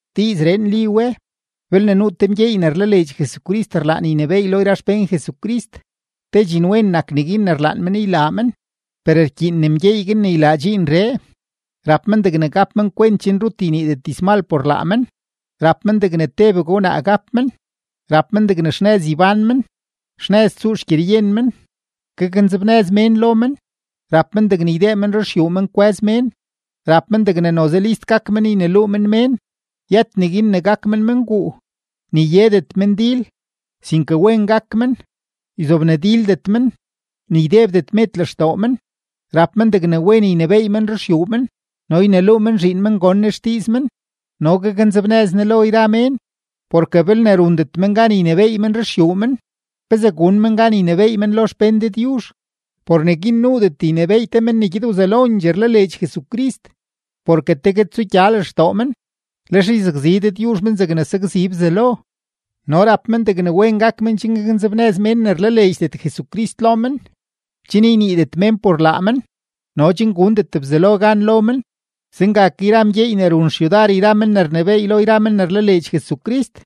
Diizree nli we: belne nuu te mgyeey ne rlaleedx Jesucrist rlaan ynebééy lo yra xpén Jesucrist, te dxinwen nak neguin ne rlaan men ylaa men. Per rkyiin ne mgyeey guin ne ylaa dxiinree, rap men degne gap men kwent chen rut yniidet dizmal por laa men, rap men degne tebegue wnaa gap men, rap men degne xnëz ybán men, xnëz tsuu xgyeryen men, gaknzebnëz mén lo men, rap men degne ydee men ruxyuu men kwë́z mén, rap men degne noze list gak men yneluu men mén; yët neguin ne gak men menguu, ni yedet men dil, sinke wen gak men, yzobnadildet men, ni ydebdet med lextoo men. Rap men degne wen ynebééy men ruxyuu men, no yneluu men zhiin men gon ne xdiiz men no gaknzebnëz ne lo yra mén. Porke belne rundet men gan ynebééy men ruxyuu men, ¿pezee gun men gan ynebééy men lo xpén Dëdyuzh? Por neguin nuudet ynebééy te men ne gyed wzelondxee rlaleedx Jesucrist, porke tegue tsugya lextoo men, lex yzakzi Dëdyuzh men zegne sakzi Bzelo. No rap men degne wen gak men chen gaknzebnëz mén ne rlaleedxdet Jesucrist lo men, chen yniidet mén por laa men no chen gundet Bzelo gan lo men. Zenga ke yra mgyeey ne run xyudar yra men ne rnebééy lo yra men ne rlaleedx Jesucrist,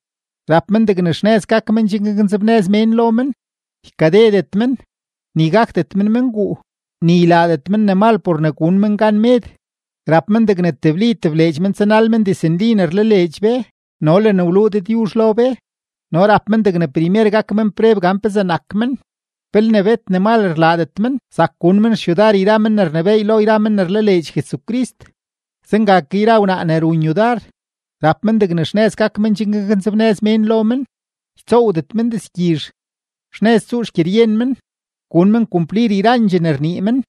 rap men degne xnëz gak men chen gaknzebnëz mén lo men, ykadedet men, ni gakdet men menguu, ni ylaadet men ne mal por ne gun men gan med. Rap men degne tebli tebleedx men tsanal men diznli ne rlaleedx be no le ne wluu Dëdyuzh lo be. No rap men degne primer gak men preb gan pezee nak men. Belne bet ne mal rlaadet men, sak gun men xyudar yra men ne rnebééy lo yra men ne rlaleedx Jesucrist. Zenga ke yra wnaa ne run yudar, rap men degne xnëz gak men chen gaknzebnëz mén lo men, ytsoowdet men dizgyizh, xnëz tsuu xgyeryen men, gun men kumplir yrandxee ne rnii men.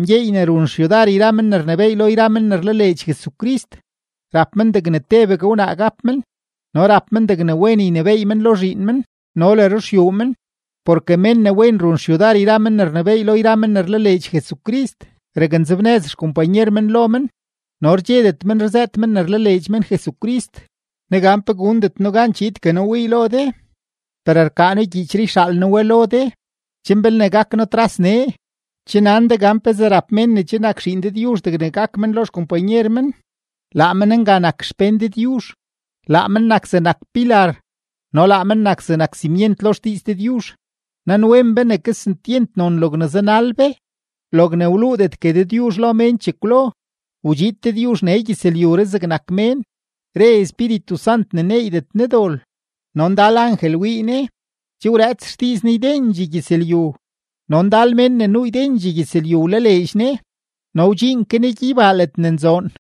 Mgyeey ne run xyudar yra men ne rnebééy lo yra men ne rlaleedx Jesucrist, rap men degne tebegue wnaa gap men no rap men degne wen ynebééy men lo zhiin men no le ruxyuu men. Porke mén ne wen run xyudar yra men ne rnebééy lo yra men ne rlaleedx Jesucrist, raknzebnëz xkompanyer men lo men no rdxedet men rzëët men ne rlaleedx men Jesucrist. Negan pe gundet noo gan chiidgue noo wii lo de; per rkaa noo gyiichree yxaal noo we lo de, chen belne gak noo tras nee, che nan de gan pezee rap mén ne che nak zhiin Dëdyuzh degne gak men lo xkompanyer men. Laa men nga nak xpén Dëdyuzh, laa men nak zegnak pilar no laa men nak zegnak simyent lo xdiiz Dëdyuzh. Nanwen be ne kesentyent non logne zanal be, logne wluudetgue Dëdyuzh lo mén chekwlo: Wdxiid Dëdyuzh nee gyëzlyuree zegnak mén; re Espíritu Sant ne neeydet Ne dol, no ndal angel wii Ne. Che wrëëts xdiiz Ne ydendxee gyëzlyu, no ndal mén ne nuu ydendxee gyëzlyu wlaleedx Ne, no wdxiin ke Ne gyeybaa ledne nzoon.